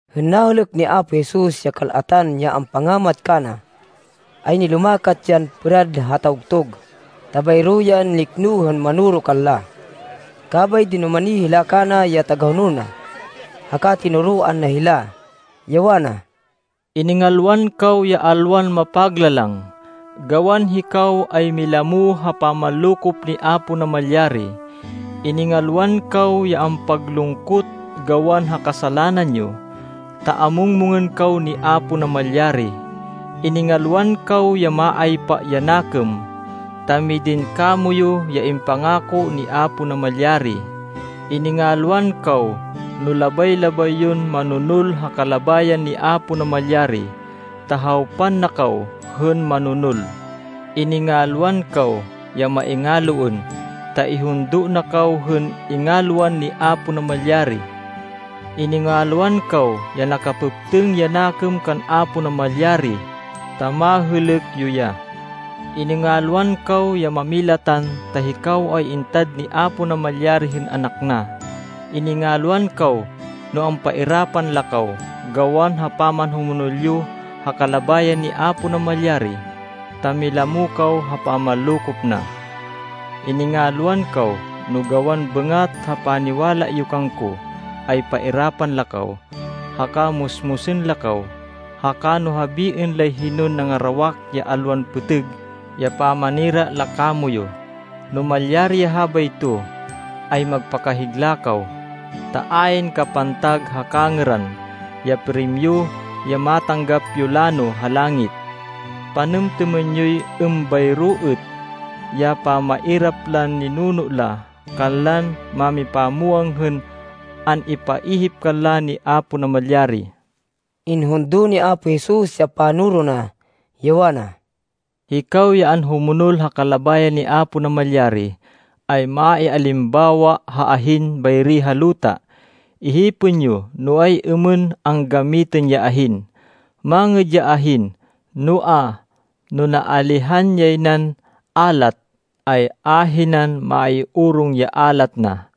Hên nahêlêk ni Apo Jesus ya kal-atan ya ampangamat kana, ay nilumakat yan pêrad ha tawgtug, ta bayro yan nikno hên manoro kanla. Kabay dinumani hila kana ya tagahonol na. Haka tinoroan na hila, ya wana, “Iningalwan kaw ya alwan mapaglalang, gawan hikaw ay milamo ha pamanlokop ni Apo Namalyari. Iningalwan kaw ya ampaglungkot gawan ha kasalanan yo, ta amung-mungên kaw ni Apo Namalyari. Iningalwan kaw ya maaypa ya nakêm, ta midin kamoyu ya impangako ni Apo Namalyari. Iningalwan kaw no labay-labay yon manonol ha kalabayan ni Apo Namalyari, ta hawpan na kaw hên manonol. Iningalwan kaw ya maingaloên, ta ihundo na kaw hên ingalwan ni Apo Namalyari. Iningalwan kaw ya nakapêptêng ya nakêm kan Apo Namalyari, ta mahêlêk yo ya. Iningalwan kaw ya mámilatan, ta hikaw ay itad ni Apo Namalyari hên anak na. Iningalwan kaw no ampairapan la kaw gawan ha pamanhumonol yo ha kalabayan ni Apo Namalyari, ta milamo kaw ha pamanlokop na. “Iningalwan kaw no gawan bêngat ha paniwala yo kangko, ay pairapan la kaw, haka musmusên la kaw, haka no habiên lay hinon nangarawak ya alwan pêtêg ya pamanira la kamoyu. No malyari ya habayto, ay magpakahigla kaw, ta ayn kapantag ha kangêran, ya primyo ya matanggap yo lano ha langit. Panêmtêmên yoy êmbayro êt ya pamairap lan ninuno la kanlan mámipamwang hên an-ipaihip kanla ni Apo Namalyari.” Inhundo ni Apo Jesus ya panoro na, ya wana, “Hikaw ya anhumonol ha kalabayan ni Apo Namalyari, ay maialimbawa ha ahin bayri ha luta. Ihipên yo no ay-êmên anggamitên ya ahin. Mangêd ya ahin, noa, no naalihan yay nan alat, ay ahinan maiorong ya alat na.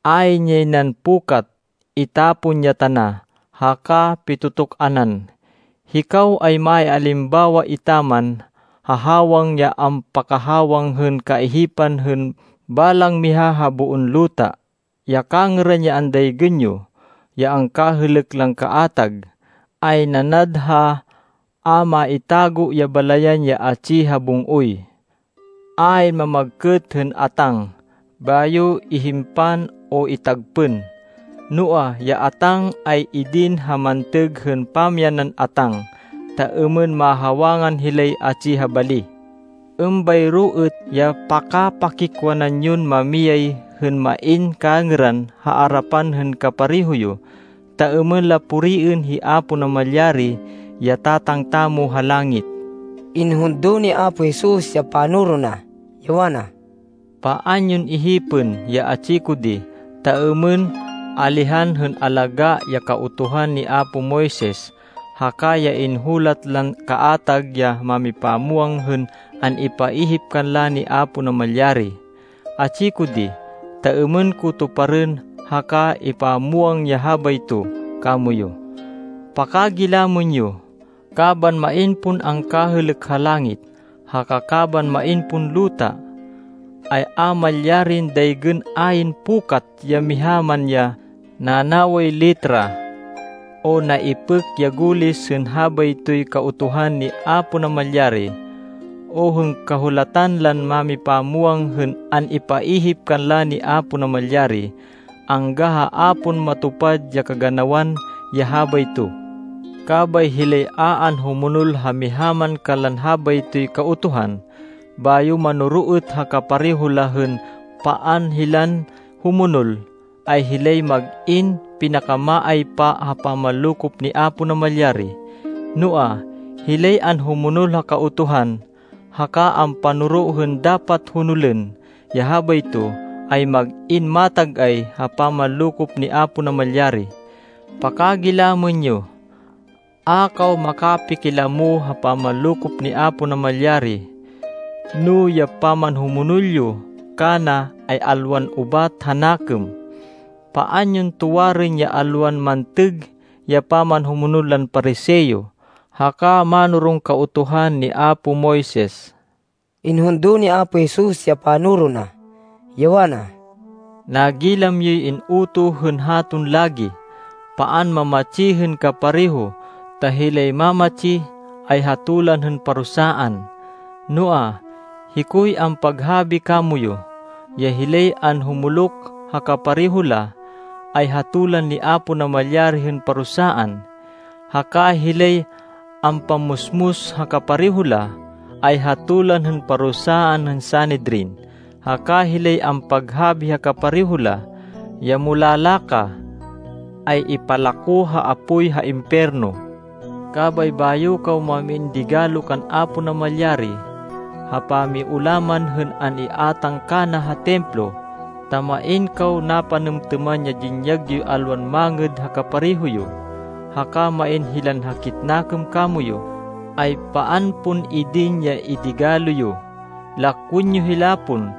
Ayn yay nan pukat! Itapon ya tana haka pitu-tuk-anan. “Hikaw ay maialimbawa etaman ha hawang ya ampakahawang hên kaihipan hên balang miha ha boon luta. Ya kangêran ya andaygên yo, ya angkahêlêk lan kaatag, ay nanad ha a maitago ya balayan ya atsi ha bung-oy. Ayn mamagkêt hên atáng, bayo ihimpan o itagpên. Noa, ya atáng ay idin ha mantêg hên pamyanan atáng, ta êmên mahawangan hilay atsi ha bali. Êmbayro êt ya pakapakikwanan yon mamiyay, hên main kangêran ha arapan hên kapareho yo, ta êmên la puriên hi Apo Namalyari, ya Tatang tamo ha langit.” Inhundo ni Apo Jesus ya panoro na, ya wana, “Paan yon ihipên ya atsi ko di, ta êmên alihan hên alagá ya Kautuhan ni apo Moises, haka ya inhulat lan kaatag ya mámipamwang hên an-ipaihip kanla ni Apo Namalyari. Atsi ko di, ta êmên ko tuparên haka ipamwang ya habayto kamoyu. Pakagilamên yo, kaban main pon angkahêlêk ha langit, haka kaban main pon luta, ay a malyarin daygên ayn pukat ya miha man ya nanaway letra o naipêk ya gulis hên habaytoy Kautuhan ni Apo Namalyari, o hên Kahulatan lan mámipamwang hên an-ipaihip kanla ni Apo Namalyari, angga ha a pon matupad ya kaganawan ya habayto. Kabay hilay a anhumonol ha miha man kanlan habaytoy Kautuhan, bayo manoro êt ha kapareho la hên paan hilan humonol, ay hilay mag-in pinakamaaypa ha pamanlokop ni Apo Namalyari. Noa, hilay anhumonol ha Kautuhan, haka ampanoro hên dapat honolên ya habayto, ay mag-in matag-ay ha pamanlokop ni Apo Namalyari. Pakagilamên yo, a kaw makapakilamo ha pamanlokop ni Apo Namalyari, no ya pamanhumonol yo kana ay alwan ubat ha nakêm. Paan yon tuwarên ya alwan mantêg ya pamanhumonol lan Pariseo haka mánoron Kautuhan ni apo Moises.” Inhundo ni Apo Jesus ya panoro na, ya wana, “Nagilam yoy in-utoh hên haton lagi, ‘Paan mamatsi hên kapareho ta hilay mamatsi, ay hatolan hên parusaan.’ Noa, hikoy ampaghabi kamoyu, ya hilay anhumuluk ha kapareho la, ay hatolan ni Apo Namalyari hên parusaan, haka hilay ampammusmus ha kapareho la, ay hatolan hên parusaan hên Sanedrin. Haka hilay ampaghabi ha kapareho la, ya ‘Mulala ka!’ ay ipalako ha apoy ha impiyerno. Kabay bayo kaw mam-in digalo kan Apo Namalyari ha pamiulaman hên an-iátang kana ha Templo, ta main kaw napanêmtêman ya dinyag yoy alwan mangêd ha kapareho yo, haka main hilan hakit nakêm kamoyu, ay paan pon idin ya idigalo yo. Lakwên yo hila pon,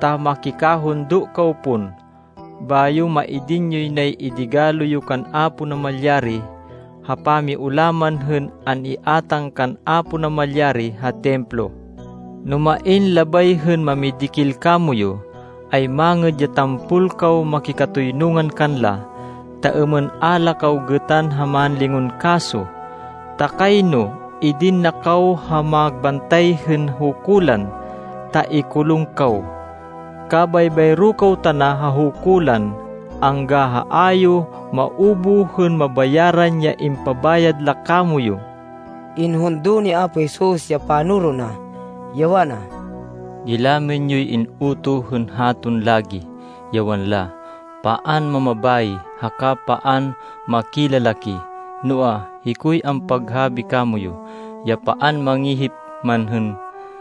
ta makikahundo kaw pon. Bayo maidin yoy nay idigalo yo kan Apo Namalyari ha pamiulaman hên an-iátang kan Apo Namalyari ha Templo. “No main labay hên mamidikil kamoyu, ay mangêd ya tampol kaw makikatoynungan kanla, ta êmên a la kaw gêtan ha mánlingon kaso. Ta kayno idin na kaw ha magbantay hên hukulan, ta ikulung kaw. Kabay bayro kaw tana ha hukulan angga ha a yo maubuh hên mabayaran ya ipabayad la kamoyu.” Inhundo ni Apo Jesus ya panoro na, ya wana, “Nagilam yoy in-utoh hên haton lagi, ya wanla, ‘Paan mamabayi haka paan makilalaki.’ Noa, hikoy ampaghabi kamoyu, ya paan mangihip man hên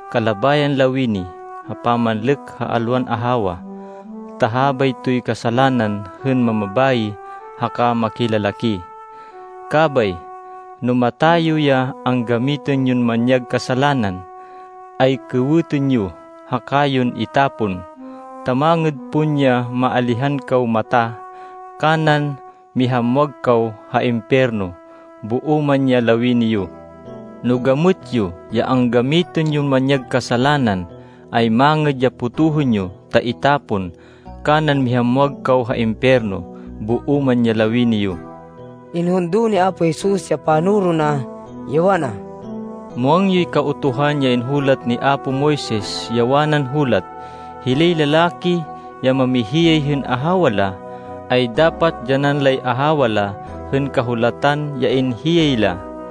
kalabayan lawini ha pamanlêk ha alwan ahawa, ta habaytoy kasalanan hên mamabayi haka makilalaki. Kabay, no mata yo ya anggamitên yon manyag kasalanan, ay kêwêtên yo, haka yon itapon. Ta mangêd pon ya maalihan kaw mata, kanan mihamwag kaw ha impiyerno, boo man ya lawini yo. No gamêt yo ya anggamitên yon manyag kasalanan, ay mangêd ya potohên yo ta itapon, kanan mihamwag kaw ha impiyerno, boo man ya lawini yo.” Inhundo ni Apo Jesus ya panoro na, ya wana, “Muwang yoy Kautuhan ya hinulat ni apo Moises, ya wanan hulat, ‘Hilay lalaki ya mamihiyay hên ahawa la, ay dapat dyanan lay ahawa la hên kahulatan ya inhiyay hila.’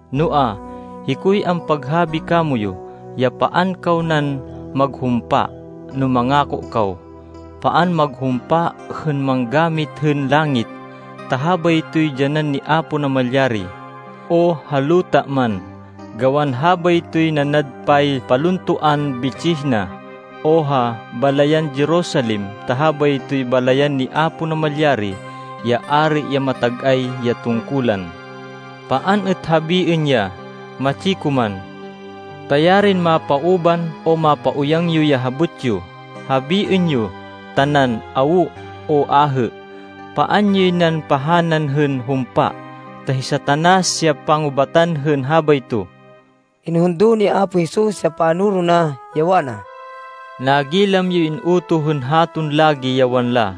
Noa, hikoy ampaghabi kamoyu, ya paan kaw nan maghumpa no mangako kaw! Paan maghumpa hên manggamit hên langit, ta habaytoy dyanan ni Apo Namalyari, o ha luta man, gawan habaytoy nanad paypaluntoan bitsih na, o ha balayan Jerusalem, ta habaytoy balayan ni Apo Namalyari, ya Ari ya matag-ay ya tungkulan. Paan êt habiên ya ‘Matsi ko man.’ Ta yarin mapauban, o mapauyang yo ya habot yo! Habiên yo tanan, ‘Awo,’ o ‘Ahê.’ Paan yoy nan pahanan hên humpa, ta hi Satanas ya pangubatan hên habayto.” Inhundo ni Apo Jesus ya panoro na, ya wana, “Nagilam yoy in-utoh hên haton lagi, ya wanla,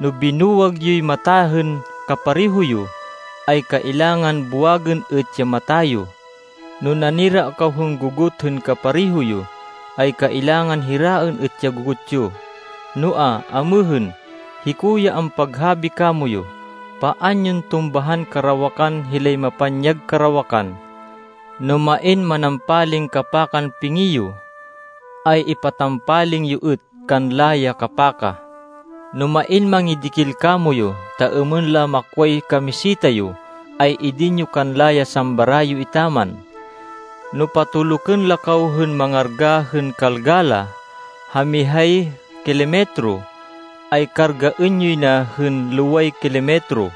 ‘No binuwag yoy mata hên kapareho yo, ay kailangan buwagên êt ya mata yo. No nanira kaw hên gogot hên kapareho yo, ay kailangan hiraên êt ya gogot yo.’ Noa, amêhên hiko ya ampaghabi kamoyu, paan yon tumbahan karawakan hilay mapanyag karawakan. No main manampaling kapakan pingi yo, ay ipatampaling yo êt kanla ya kapaka. No main mangidikil kamoyu, ta êmên la makway kamiseta yo, ay idin yo kanla ya sambra yo etaman. No patolukên la kaw hên mangarga hên kalga la ha mihay kilometro, ay kargaên yoy na hên loway kilometro.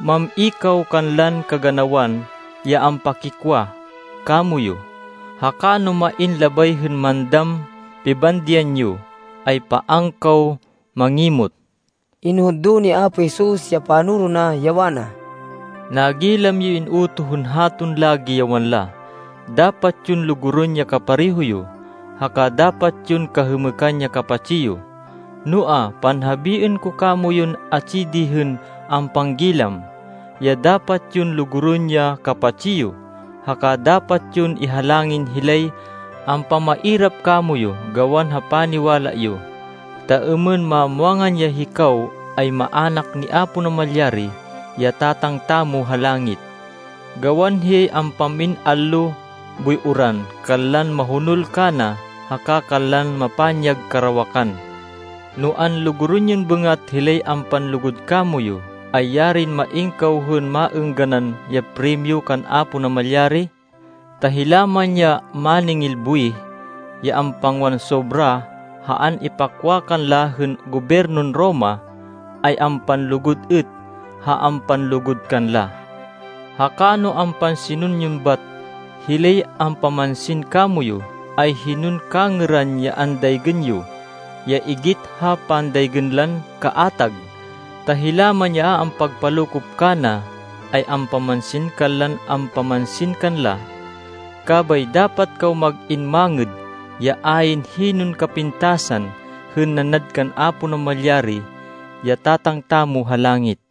Mam-i kaw kanlan kaganawan ya ampakikwa kamoyu, haka no main labay hên mandam pibandian yo, ay paan kaw mangimot.” Inhundo ni Apo Jesus ya panoro na, ya wana, “Nagilam yoy in-utoh hên haton lagi, ya wanla, ‘Dapat yon lugurên ya kapareho yo, haka dapat yon kahêmêkan ya kapatsi yo.’ Noa, panhabiên ko kamoyun atsi di hên ampanggilam, ya dapat yon lugurên ya kapatsi yo, haka dapat yon ihalangin hilay ampamairap kamoyu gawan ha paniwala yo, ta êmên mamwangan ya hikaw ay maának ni Apo Namalyari, ya Tatang tamo ha langit. Gawan hiyay ampam-in allo boy uran kanlan mahonol kana haka kanlan mapanyag karawakan. No anlugurên yon bêngat hilay ampanlugud kamoyu, ay yarin main kaw hên maêngganan ya primyo kan Apo Namalyari. Ta hila man ya máningil buwih, ya ampangwan sobra ha an-ipakwa kanla hên gobyernon Roma, ay ampanlugud êt ha ampanlugud kanla. Haka no ampansinên yon bat hilay ampamansin kamoyu, ay hinon kangêran ya andaygên yo ya igit ha pandaygên lan kaatag, ta hila man ya a ampagpalokop kana, ay ampamansin kanlan ampamansin kanla. Kabay dapat kaw mag-in mangêd ya ayn hinon kapintasan hên nanad kan Apo Namalyari, ya Tatang tamo ha langit.”